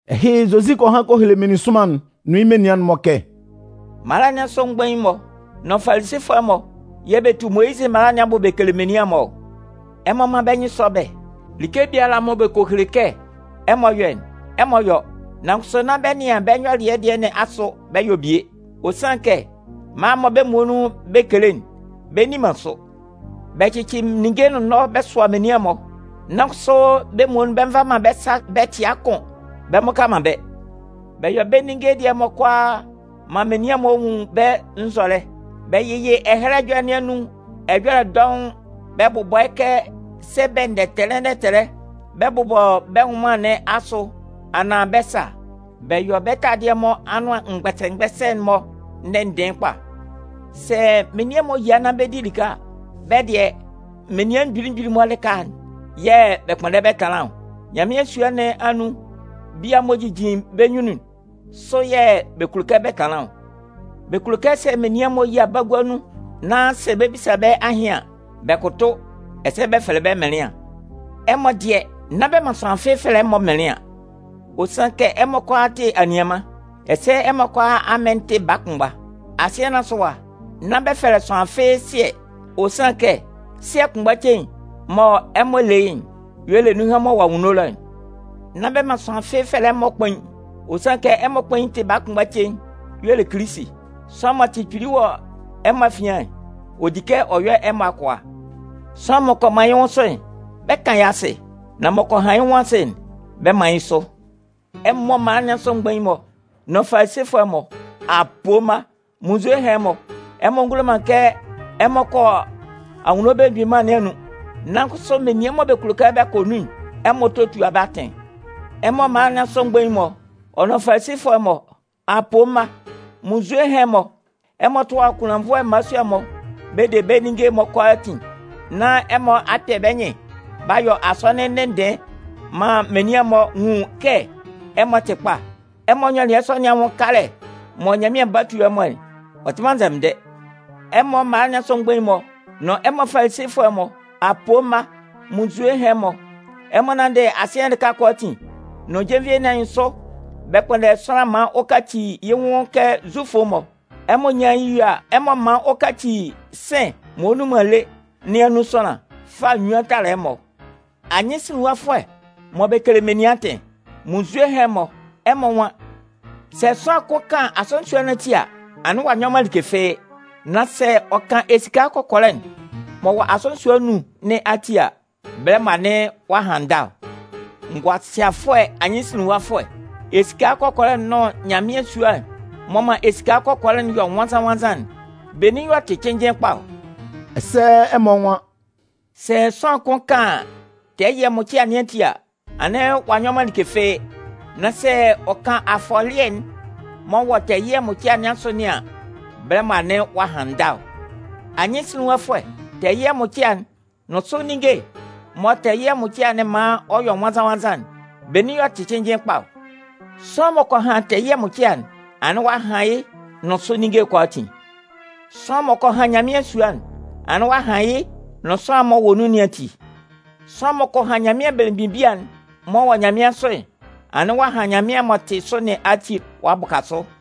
Ɛhɩ, Zozi kɔ han kɔ hele meninsʋnman'n nʋn yɩ́ menian'n-mɔ kɛ: “Mala nɩn asʋ mgbain'n-mɔ nʋn Falisifʋɛ'n-mɔ yɛ̂ bɛ tu Moyizɩ mala nɩn abʋ bɛ kele menian'n-mɔ ɔ. Ɛmɔ mán bɛ́ nyɩn sɔ́ bɛ́. Like biala mɔ bɛ kɔ hele kɛ ɛmɔ yɔ́'n, ɛmɔ yɔ́. Nan kʋsʋ nán bɛ nɩan bɛ́ nyɔlɩɛ dɩɛ nɩn asʋ bɛ yɔ bie. Ɔ sanlɩn kɛ mala'n mɔ bɛ́ muonun bɛ kele'n, bɛ nni man sʋ. Bɛ cɩcɩ ninnge nʋnnɔɛ bɛ sʋa menian'n-mɔ, nan kʋsʋ bɛ́ muonun bɛ nva man bɛ́ sa bɛtɩa kʋn bɛ mmʋka man bɛ́. Bɛ yɔ bɛ́ ninnge dɩɛ'n-mɔ kʋalaa maan menian'n-mɔ nwun bɛ́ nzɔlɛ. Bɛ yɩyɩ Ɛhɛlɛ Ɛjɔlɛ nɩn anun ɛjɔlɛ'n dɔʋn bɛ bɔ yɩ́ kɛ sɛbɛ ndɛtɛlɛ ndɛtɛlɛ bɛ bʋbɔ bɛ́ nwʋnman nɩn asʋ anaan bɛ́ sa. Bɛ yɔ bɛ́ taladɩɛ'n-mɔ anʋan mgbɛsɛ-mgbɛsɛ'n-mɔ ndɩnndɩɩn kpa. Sɛ menian'n-mɔ yia nán bɛ 'di like a, bɛ́ dɩɛ, menian mgbili mgbili'n-mɔ lɩka'n yɛ̂ bɛ kpʋnndɛ bɛ tanlan ɔ. Nyanmɩan sua nɩn anun bia'n-mɔ m'ɔ jijin bɛ́ nyunnun'n, sʋ yɛ̂ bɛ kulo kɛ bɛ tanlan ɔ. Bɛ kulo kɛ sɛ menian'n-mɔ yia bagua nun nán sɛ bɛ 'bisa bɛ́ ahɩn an, bɛ kʋ́tʋ, ɛsɛ bɛ fɛ́lɛ bɛ́ ‘mɩnlɩan’. “Ɛmɔ dɩɛ, nán bɛ man sʋanlan fɩ́ɩ́ fɛlɛ ɛmɔ ‘Mɩnlɩan’. Ɔ sanlɩn kɛ ɛmɔ kʋalaa tɩ anianman, ɛsɛ ɛmɔ kʋalaa Amɩn'n tɩ baa kʋnmgba. Asɩɛ nɩn asʋ ɛwa, nán bɛ fɛlɛ sʋanlan fɩ́ɩ́ ‘Sɩɛ’. Ɔ sanlɩn kɛ Sɩɛ kʋnmgba cein'n mɔ ɛmɔ le yɩ́'n, y'ɔ le nunhan'n m'ɔ wɔ anwunno ɛlɔ'n. Nán bɛ man sʋanlan fɩ́ɩ́ fɛlɛ ɛmɔ ‘Kpain’. Ɔ sanlɩn kɛ ɛmɔ Kpain'n tɩ baa kʋnmgba cein, y'ɔ le Kilisi. Sʋanlan m'ɔ tɩ kpili wɔ ɛmɔ afian'n, ɔ di kɛ ɔ yɔ ɛmɔ akʋa. Sʋanlan m'ɔ kɔ man yɩ́ nwʋn sʋ'n, bɛ 'kan yɩ́ asɩ, nan m'ɔ kɔ han yɩ́ nwʋn asɩ'n, bɛ 'man yɩ́ sʋ. “Ɛmɔ mala nɩn asʋ mgbain'n-mɔ nʋn ɛmɔ Falisifʋɛ'n-mɔ, apoo mma, munnzue hán ɛmɔ! Ɛmɔ ngulo man kɛ ɛmɔ kɔ Anwunno Belemgbin Mân nɩn anun, nan kʋsʋ menian mɔ bɛ kulo kɛ bɛ kɔ nun'n, ɛmɔ totua bɛ́ atɩn. [ “Ɛmɔ mala nɩn asʋ mgbain'n-mɔ nʋn ɛmɔ Falisifʋɛ'n-mɔ, apoo mma, munnzue hán ɛmɔ! Ɛmɔ tʋa kunlannvʋɛ mmalasua'n-mɔ bɛ de bɛ́ ninnge'n kʋalaatin nán ɛmɔ a kpɛ bɛ́ nyɩn b'a yɔ asɔnɩn ndɩnndɩɩn maan menian'n-mɔ nwun kɛ ɛmɔ tɩ kpa. Ɛmɔ nyɔlɩɛ sɔ nɩn anwʋn kalɛ mɔ Nyanmɩan 'ba tua ɛmɔ'n, ɔ tɩ man nzɛmɩndɛ.] “Ɛmɔ mala nɩn asʋ mgbain'n-mɔ nʋn ɛmɔ Falisifʋɛ'n-mɔ, apoo mma, munnzue hán ɛmɔ. Ɛmɔ nanndɩ asɩɛ'n lɩka kʋalaatin nʋn jenvie nɩn anyɩnsʋ bɛ kpʋnndɛ sʋanlan maan ɔ kaci yɩ́ nwʋn kɛ Zufʋ'n-mɔ. Ɛmɔ nyan yɩ́ yue a, ɛmɔ man ɔ kaci sɩ̂n'n m'ɔ nnun man lé nɩn anun sʋanlan fâ nnyuan tala ɛmɔ. “Anyɩnsinlinwafʋɛ mɔ bɛ kekele menian atɩn, munnzue hán ɛmɔ! Ɛmɔ nwan: ‘Sɛ sʋanlan kʋn kan asɔnɩn sua nɩn ati a, anɩn ɔ'a nyɔ man like fɩ́ɩ́. Nan sɛ ɔ kan esika kɔkɔlɛ'n m'ɔ wɔ nun nɩn ati a, bɛlɛ mɔ anɩn ɔ'a han ndâ ɔ.’ Ngʋasɩafʋɛ anyɩnsinlinwafʋɛ! Esika kɔkɔlɛ'n nʋn Nyanmɩan sua'n m'ɔ man esika kɔkɔlɛ'n yɔ nwannzan-nwannzan'n, benin y'ɔ tɩ cɩnnjɩn kpa ɔ? Ɛsɛ ɛmɔ nwan: ‘Sɛ sʋanlan kʋn kan tɛɛyɩɛ mʋcɩa nɩn ati a, anɩn ɔ'a nyɔ man like fɩ́ɩ́. Nan sɛ ɔ kan afɔlɩɛ'n m'ɔ wɔ tɛɛyɩɛ mʋcɩa nɩn asʋ nɩn an, bɛlɛ mɔ anɩn ɔ'a han ndâ ɔ.’ Anyɩnsinlinwafʋɛ! Tɛɛyɩɛ mʋcɩa'n nʋn sʋ ninnge'n mɔ tɛɛyɩɛ mʋcɩa'n man ɔ yɔ nwannzan-nwannzan'n, benin y'ɔ tɩ cɩnnjɩn kpa ɔ? Sʋanlan m'ɔ kɔ han tɛɛyɩɛ mʋcɩa'n, anɩn ɔ'a han yɩ́ nʋn sʋ ninnge'n kʋalaatin. Sʋanlan m'ɔ kɔ han Nyanmɩan sua'n, anɩn ɔ'a han yɩ́ nʋn sʋanlan'n m'ɔ wɔ nun nɩn ati. Sʋanlan m'ɔ kɔ han Nyanmɩan belemgbin bia'n m'ɔ wɔ nyanmɩansʋ'n, anɩn ɔ'a han Nyanmɩan m'ɔ tɩ sʋ nɩn ati ɔ'a bʋka sʋ.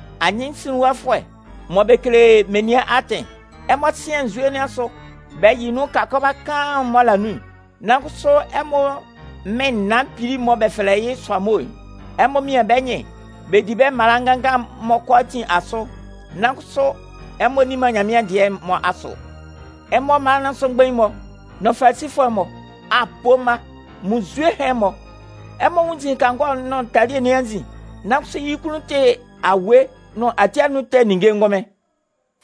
Anyɩnsinlinwafʋɛ mɔ bɛ kekele menian atɩn! Ɛmɔ sɩan nzue nɩn asʋ bɛ yɩ nun kakʋba kaan'n mɔ la nun'n, nan kʋsʋ ɛmɔ mɩn naan kpili'n mɔ bɛ fɛlɛ yɩ́ sʋamo'n! Ɛmɔ mian bɛ́ nyɩn bɛ di bɛ́ mala nganngan'n-mɔ kʋalaatin asʋ, nan kʋsʋ ɛmɔ nni Nyanmɩan dɩɛ'n-mɔ asʋ. “Ɛmɔ mala nɩn asʋ mgbain'n-mɔ nʋn ɛmɔ Falisifʋɛ'n-mɔ, apoo mma, munnzue hán ɛmɔ! Ɛmɔ nwunnzin kangɔ'n nʋn talie nɩn anzin'n, nan kʋsʋ yɩ́ kunnun tɩ awue nʋn ati anun ɛtɛ ninnge ngʋnmɩn.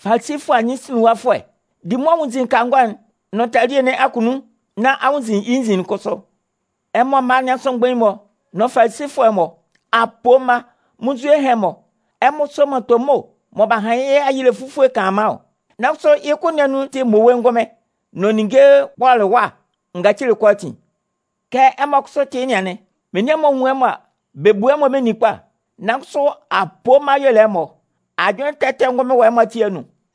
Falisifʋɛ anyɩnsinlinwafʋɛ, di mʋa nwunnzin kangɔ'n nʋn talie nɩn akunnun nán a nwunnzin yɩ́ nzin'n kʋsʋ. “Ɛmɔ mala nɩn asʋ mgbain'n-mɔ nʋn ɛmɔ Falisifʋɛ'n-mɔ, apoo mma, munnzue hán ɛmɔ! Ɛmɔ soman tomo mɔ b'a han yɩ́ ayile fufue kanlanman ɔ. Nan kʋsʋ yɩ́ kʋ nɩn anun tɩ mmowe ngʋnmɩn nʋn ninnge kpɔlɔlɩwa ngacile kʋalaatin. Kɛ ɛmɔ kʋsʋ tɩ yɩ́ nɩn anɩn. Menian'n-mɔ nwun ɛmɔ a, bɛ bu ɛmɔ meninkpa. Nan kʋsʋ apoo mma y'ɔ le ɛmɔ, ajʋnlɩn ɛtɛ ɛtɛ ngʋnmɩn wɔ ɛmɔ ati anun.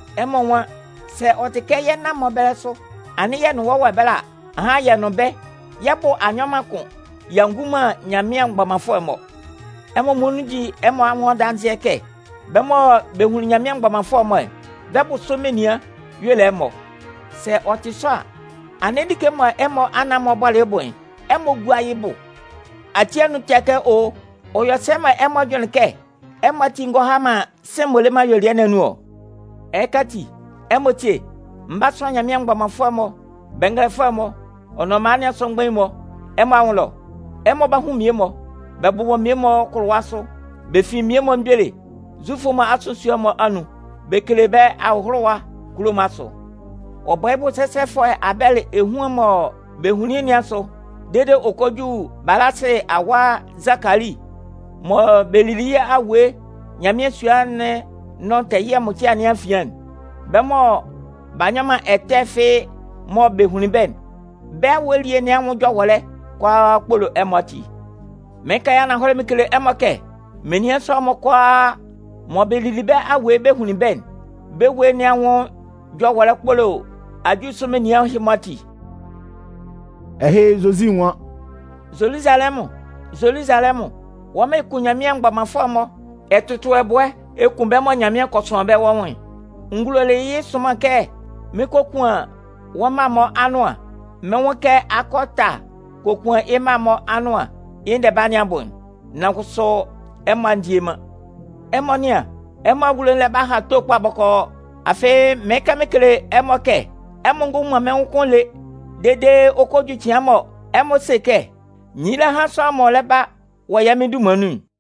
Ɛmɔ nwan: ‘Sɛ ɔ tɩ kɛ yɛ́ nan-mɔ bɛlɛ sʋ anɩn yɛ wɔ ɛbɛlɛ a, ahan yɛ́ nʋn bɛ́, yɛ́ bʋ a nyɔ man kʋ́n y'a ngun man Nyanmɩan mgbɔmanfʋɛ'n-mɔ.’ Ɛmɔ muonun di ɛmɔ anwʋn adanzɩɛ kɛ bɛ́ mɔ bɛ hunlin Nyanmɩan mgbɔmanfʋɛ'n-mɔ, bɛ́ bʋsʋ menian y'ɔ le ɛmɔ. Sɛ ɔ tɩ sɔ a, anɩn like mɔ ɛmɔ anan-mɔ bɔlɩ yɩ́ bʋ'n, ɛmɔ gúa yɩ́ bʋ! “Ati ɛtɛ mma kɛ owo! Ɔ yɔ sɛ mɔ ɛmɔ jʋnlɩn kɛ ɛmɔ ati ngɔ ha man sɩ̂n'n m'ɔ le man ayuelɩɛ nɩn anun ɔ? Ɛhɩka ati, ɛmɔ tíe. Mɩn 'ba sʋan Nyanmɩan mgbɔmanfʋɛ'n-mɔ, bɛngɛlɛfʋɛ'n-mɔ, nʋn mala nɩn asʋ mgbain-mɔ ɛmɔ anwʋn ɛlɔ. Ɛmɔ 'ba hun mmie-mɔ, bɛ bʋbɔ mmie-mɔ kʋlʋwa sʋ, bɛ fin mmie-mɔ mgbele Zufʋ'n-mɔ asɔnɩn sua'n-mɔ anun, bɛ kele bɛ́ ahʋlʋwa kulo'n-mɔ asʋ. Ɔ bɔ yɩ́ bʋ sɛsɛfʋɛ Abɛlɩ ehuan'n mɔ bɛ hunlin yɩ́ nɩn asʋ dede ɔ kɔ ju Balasi awa Zakali mɔ bɛ lili yɩ́ awue Nyanmɩan sua'n nʋn tɛɛyɩɛ mʋcɩa nɩn afian'n, bɛ́ mɔ b'a nyɔ man ɛtɛ fɩ́ɩ́ mɔ bɛ hunlin bɛ́'n, bɛ́ awue elie nɩn anwʋn jɔwɔlɛ'n kʋalaa kpolo ɛmɔ ati. Mɩɩn kan yɩ́ ananhɔlɛ mɩn kele ɛmɔ kɛ menian sɔ'n-mɔ kʋalaatin mɔ bɛ lili bɛ́ awue bɛ hunlin bɛ́'n, bɛ́ ewue nɩn anwʋn jɔwɔlɛ'n 'kpolo ajulisʋ menian ɛhɩ-mɔ ati.” Ɛhɩ, Zozi nwan: “Zoluzalɛmʋn, Zoluzalɛmʋn, wɔ́ mɔ ɛ kun Nyanmɩan mgbɔmanfʋɛ'n-mɔ ɛ tʋtʋ ɛbʋɛ ɛ kun bɛ́ mɔ Nyanmɩan kɔ sʋan bɛ́ wɔ́ nwʋn'n, n gulolɩ yɩ́ sʋnman kɛ mɩn kokuan wɔ́ mma'n-mɔ anʋan mɩ́n nwʋn kɛ akɔ ɛta kokuan yɩ́ mma'n-mɔ anʋan yɩ́ ndɛba'n-mɔ abʋ'n, nan kʋsʋ ɛmɔ a ndie man! Ɛmɔ nɩ́an, ɛmɔ awulo'n lɛ ba ha to kpa bɔkɔɔ. Afɩ mɩɩn kan mɩn kele ɛmɔ kɛ ɛmɔ ngɔ nwun man mɩ́n nwʋn kʋ́n lé dede ɔ 'ju cɩan mɔ ɛmɔ 'se kɛ: ‘Nyila hán sʋanlan'n m'ɔ lɛ ba wɔ yɛ́ Mɩn dunman nun'n.’”